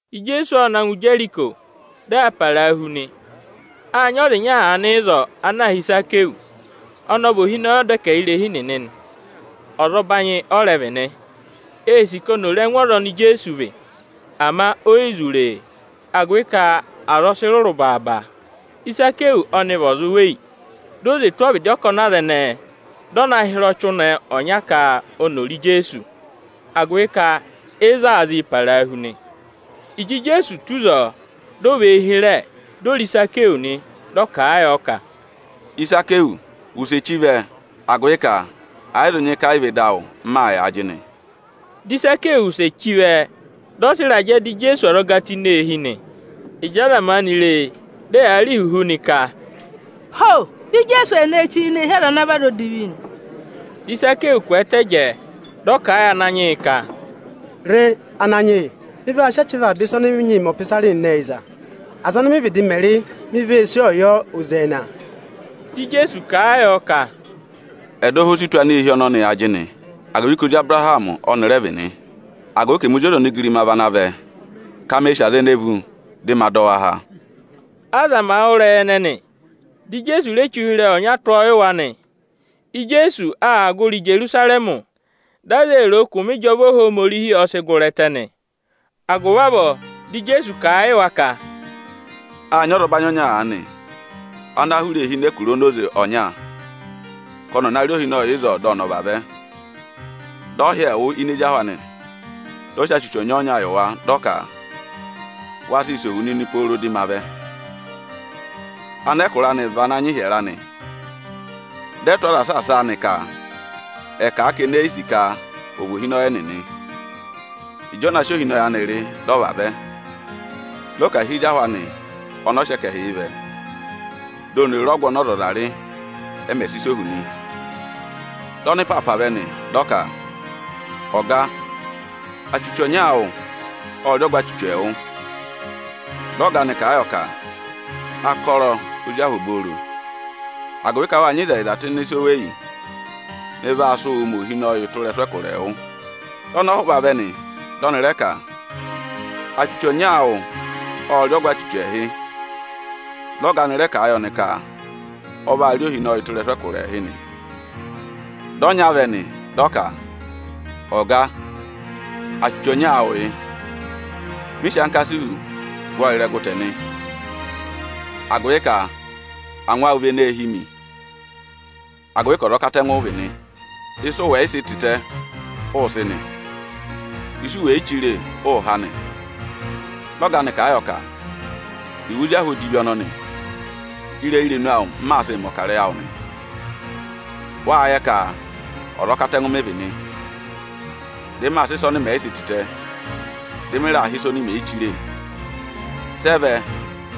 Ijeesu ọ na ngụ Ijeriko, dị aa parahu nị. Â nyị ọza ịnya aanị ịzọọ ana aā hị́ Ịzakịyọsị. Ọnị ọ vị ohinọyị ọdẹkẹhirehi nịnị nị, ọzọbanyị ọ rẹ vị nị. Ee sì ka oni ò re ẹngụ ọza oni Ijeesu vị, ama o yi zụ re e, agụvị ka aza ọ sị rụrụ baaba. Ịzakịyọsị ọnị vị ọza oweyi. Di o zwe tụ́ ọvịdị ọkọnị aza ẹnẹẹ, dị ọ na hịrẹ ọchị ụnẹ ọnya ka oni ò re Ijeesu, agụvị ka ịzọọ aa zịị parahu nị. Ịjị Ijeesu tù ịzọọ, dị ọ và eyi hịrẹ, di o re Ịzakịyọsị nị. Dị ọ kà a yọ ka, “Ịzakịyọsị, wụsẹ chí vẹ, agụvị ka ẹ yị zụ nyị ka ẹ yị vị ịdị awụ m maa yà ajịnị.” Dị Ịzakịyọsị wụsẹ chí vẹ, dị ọ sị ịrajẹ dọ Ijeesu ọzọga tụ́ ini eehi nị. Ịjị aza maanị ree, dị ẹyaa rị ihuhu nị, ka, “Ho! Ijeesu o ne ree chí ini irehi ọza odivi o!” Dị Ịzakịyọsị kwẹẹtẹ jẹẹ, dị ọ kà a yị Ananyị yị ka, “Re, Ananyị yị! Mị vaa sị achẹva avaba ịsa ọnị mị nyịị mẹ ọpịsarị nịnị ẹyịza; aza ọnị mị vịdị mẹ rị, mi vee sí ọọ yọ oze ẹẹna.” Dị Ijeesu kà a yọ ka, “Ẹdọha o si tù aneehi ọnọnị ajịnị; agụvị ka ọza ọnọnị ọnị rẹ vị ozi Abụrahamị. Agụvị ka ẹmị Ozi ọza onigirima vị ana vẹ ka me sì aza ene vú, dị ma dọ wa há.” Aza màa wụ́ ịrẹyị ẹnẹnị, dị Ijeesu re che ụhịrẹyị ọnya tụ́ ọọ yị wa nị. Ijeesu aa gụrị Ijerusarẹmị, dị aza ee ro o ka obobooro ọnọọ Ohomorihi aa vaa sịị zụ̀ ọ mẹmẹ aa mẹ ịjọva nị. Agụvị avọọ, dị Ijeesu kà a yị wa ka, “Â nyị ọzọbanyị ọnya aanị, ana hụrẹ eehi nọ ẹkụra onoze ọnya ka ọnị ọ̀ na rị ohinọyị ịzọọ, dị ọnị ọ̀ vavẹ. Dị ọ hị́ ẹẹwụ ini ezi ahụ anị, dị ọ sị achuchu ọnya-ọnya yị wa, dị ọ ka: ‘Waa sịị sẹ̀ ohu nịnị pooro dị ma vẹ!’ “Anẹkụra anị ệ nyị ịhyẹrẹ anị, dị ẹ tụ́ aza saasa a ka ẹ̀ kà a ka eni e yi sì ka ọ̀ vị ohinọyị ẹnịnị nị. Ịjị ọ na sị ohinọyị anị rị, dị ọ vavẹ, dị ọ ka à hị́ ezi ahụ anị ọnị ọ sị ẹkẹhị yị vẹ, di oni ò re ọgụ ọnị ọzọza rị, ẹ mẹ̀ sị sẹ̀ ohu nị. Dị ọnịpaapa vẹ nị, dị ọ ka: ‘Ọga, achuchu ọnya awụ ộ rị ọgụ achuchu ẹẹwụ.’ Dị ọga anị kà a yọ ka: ‘Akọrọ, ozi ahụ obooro! Agụvị ka wâ nyị ịzẹyịza tụ́ ịnị ịsa oweyi, mị vaa sị wụụ mẹ ohinọyị tụ́ ịrẹsụ ẹkụra ẹẹwụ.’ Dị ọnọhụva vẹ nị, dị ọnị rẹ ka: ‘Achuchu ọnya awụ ộ rị ọgụ achuchu ẹẹhị.’ Dị ọga anị rẹ kà a yị ọnị ka ọ vaa rị ohinọyị tụ́ ịrẹsụ ẹkụra ẹẹhị nị. Dị ọnya vẹ nị, dị ọ ka, ‘Ọga, achuchu ọnya awụ yị. Mị sị ankasihu gụ ọọ ịrẹgụ tẹ nị. Agụvị ka angwa awụ vị eneē hí mi, agụvị ka ọza ọkatẹngụ ụ vị nị. Ịsị ụ wẹ̀ yị sị tịtẹ, ụụ̄ sị nị; ịsị u wè yi chire, ụụ̄ há nị.’ Dị ọga anị kà a yọ ka: ‘Ẹwụ ozi ahụ odivi ọnọnị! Ịrẹyị irenu awụ m maa sịị mẹ̀ ọkarẹyị awụ nị. Wâ yẹ ka ọza ọkatẹngụ mị vị nị; dị maa sị ịsa ọnị mẹ̀ yị sị tịtẹ, dị mị raa há ịsa oni mè yi chire nị. Sị ẹ vẹ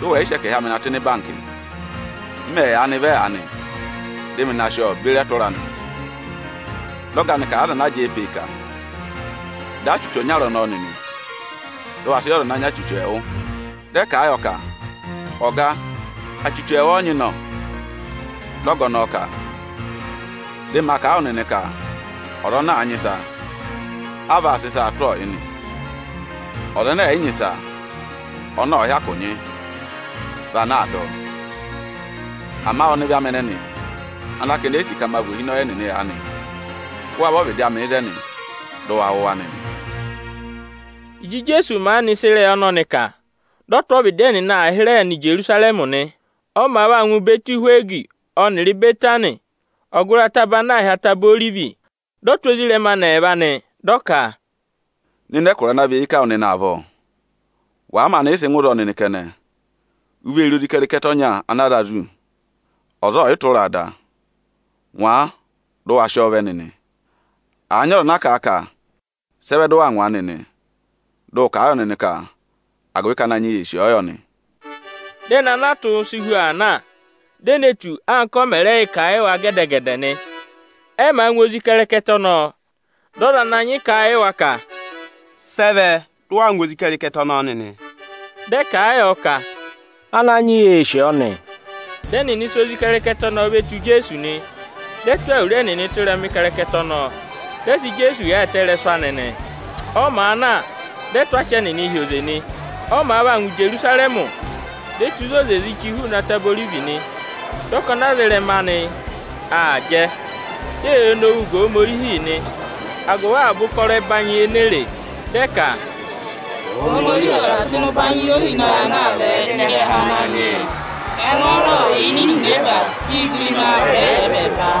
dị ụ wẹ̀ yị sị ẹkẹhị amị na tụ́ ịnị ịbankị. M mẹ̀ yaanị vẹ aanị, dị mị na sị ọọ beri ẹtụra anị.’ Dị ọga anị kà a yị aza ana jẹẹ pe e ka: ‘Dọ ọ achuchu ọnyara ọnọọ nịnị, dị ụ wa sị yị ọza ana nyị achuchu ẹẹwụ!’ Dị ẹ kà a yọ ka: ‘Ọga, achuchu ẹẹwụ ọ nyị nọ!’ Dị ọga ọnọọ ka: ‘Dị ma kà a wụ nịnị ka ọza ana àa nyị ịsa, á vaa sị ịsaa tụ́ ọọ yị nị. Ọza ẹnẹ ẹ̀ yị nyị ịsa, ọnị ọ̀ọ hyakụ nyị, vị ana aa dọ ọ. Ama ọnịvị amị ẹnẹnị ana ka eni e yi sì ka ma vị ohinọyị ẹnịnị aanị, kụ́ wa vẹ ọ́vịdị amị ịzẹnị, dị ụ wa wụ̀ wa nịnị!’” Ịjị Ijeesu maanị sị ịrẹyị ọnọnị kà, dị ọ tụ́ ọvịdị ẹnịnị aa hịrẹẹ nọ Ijerusarẹmị nị. Ọ màa vaa ngụ Ịbẹtị-Ihwegi ọnịrị Ịbẹtanị, ọgụrị ataba ana aā hị́ Ataba Orivi, dị ọ tụ́ ezirẹma anị ẹẹva nị, dị ọ ka, “Nọ ịnị ẹkụra ana và eyi ká wụ nịnị avọọ. Wàa maanị yị sị ngụ ịzọọ nịnị kẹnẹ, u vee re ozi ịkẹrịkẹtẹ ọnya ana a za zù, ọza ọọ̀ yị tụra a da. Ngwa a dị ụ wa sị ọọ vẹ nịnị! Àa nyị ọza ana kà a ka: ‘Sị ẹ vẹ dị ụ waa ngwa a nịnị?’ Dị ụ kà a yọ nịnị ka agụvị ka Ananyị yị ee sì ọọ yọ nị.” Dị ẹnị ana a tụ́ si hu aa na; di e ne tù ọ, anka ọ mẹ̀ rẹ yị kà a yị wa gẹdẹ-gẹdẹ nị. Ẹ màa ngwa ozi ịkẹrịkẹtẹ ọnọọ, dị ọza ana nyị họ̀ wa ka, “Sị ẹ vẹ dị ụ waa ngwa ozi ịkẹrịkẹtẹ ọnọọ nịnị?” Dị ẹ kà a yọ ka, “Ananyị yị ee sì ọọ nị.” Dị ẹnịnị sị ozi ịkẹrịkẹtẹ ọnọọ ve tù Ijeesu nị. Ẹnịnị ệ tụ́ awuru ẹnịnị tụ́ ịrẹma ịkẹrịkẹtẹ ọnọọ, dị ẹ sị Ijeesu yaayịtẹ ị́rẹsụ anị nị. Ọ màa na, dị aza aa tụ́ achị ẹnịnịị hi oze nị. Ọ màa vaa ngụ Ijerusarẹmị, di o tù ịzị oze zị chí hụụnị Ataba Orivi nị. Dị ọkọnị aza ịrẹma anị aa jẹ, di eyee nowuu ga Ohomorihi nị agụvị avaba ụkọrọ ẹbanyị ene e re. Dị ẹ ka, “Ohomorihi ọ̀ dà tụ́ ịnị ụbanyị yị ohinọyị ana aa vẹ ịnị ịrẹha Ananyị yị! Ẹngwọọrọ ọ̀ yà ini ihinẹba, di igirima ọ̀ rẹ yà ẹbẹẹba!”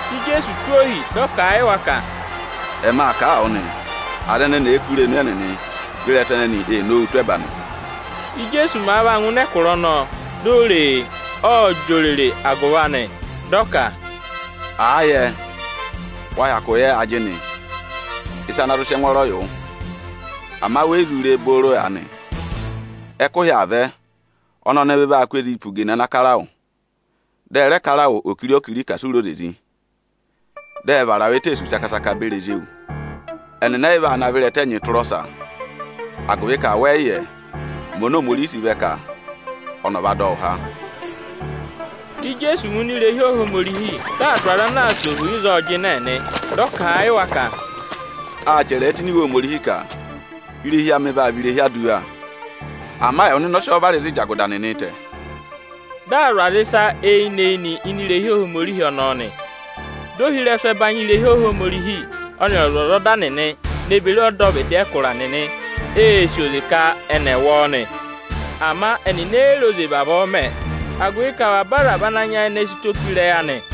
Dị Ijeesu tụ́ ohi, dị ọ kà a yị wa ka, “Ẹma kà a wụ nịnị nị, aza ẹnẹnị èe kú irenu ẹnịnị, vị ịrẹta nịnị ee nowuu tụ́ ẹba nị.” Íjeesu màa vaa ngụ ịnị Ijerusarẹmị, di o re e, ộ jị òrèrè agụvị anị. Dị ọ ka, “Àa yẹ wa hyakụ yẹ ajịnị ịsa ana zụ sị ẹngwọọrọ yị wụ! Ama we yi zụ re e nịnị booro aanị. Ẹkụhị aa vẹ ọnị ọnịvị vaa kụ́ ezii pe ugene ana kara wụ, dị ẹ rẹ kara wụ okiri-okiri ka asị u re oze zị. Dị ẹ vara wụ eteesu saka-saka beri ezi ewu. Ẹnịnị ẹ yị vaa navọ ịrẹta ẹnyịị tụra ọsa, agụvị ka wẹ yị yẹ ụmẹ oni Ohomorihi sị vẹ ka ọnị ọ̀ va dọ wụ há.” Dị Ijeesu ngụ ini irehi Ohomorihi, dị aa dụ aza ana aa sẹ̀ ohu ịzọọ jịnẹ nị. Dị ọ kà a yị wa ka, “Â chẹrẹ ẹ tụ́ ini Iwe Ohomorihi ka: ‘Irehi amị vaa vị irehi aduwa,’ ama ẹwụ nịnị ọ sị ọọ vara ịzị ịjagụda nịnịị̄ tẹ̀.” Dị aa zụ̀ aza ịsa eyinị-eyinị ini irehi Ohomorihi ọnọọ nị. Dị ohirẹsụ ẹbanyị irehi Ohomorihi ọnịrị ọzwọzọda nịnị ne beri ọdọvịdị ẹkụra nịnị ee sì oze ka ẹnị ẹ̀ wụ ọọ nị. Ama ẹnịnị e yi re oze vavọọ mẹ̀ ẹ, agụvị ka avaba aza vị ana nyayịnẹ sị ụtọ pe ịrẹyị anị.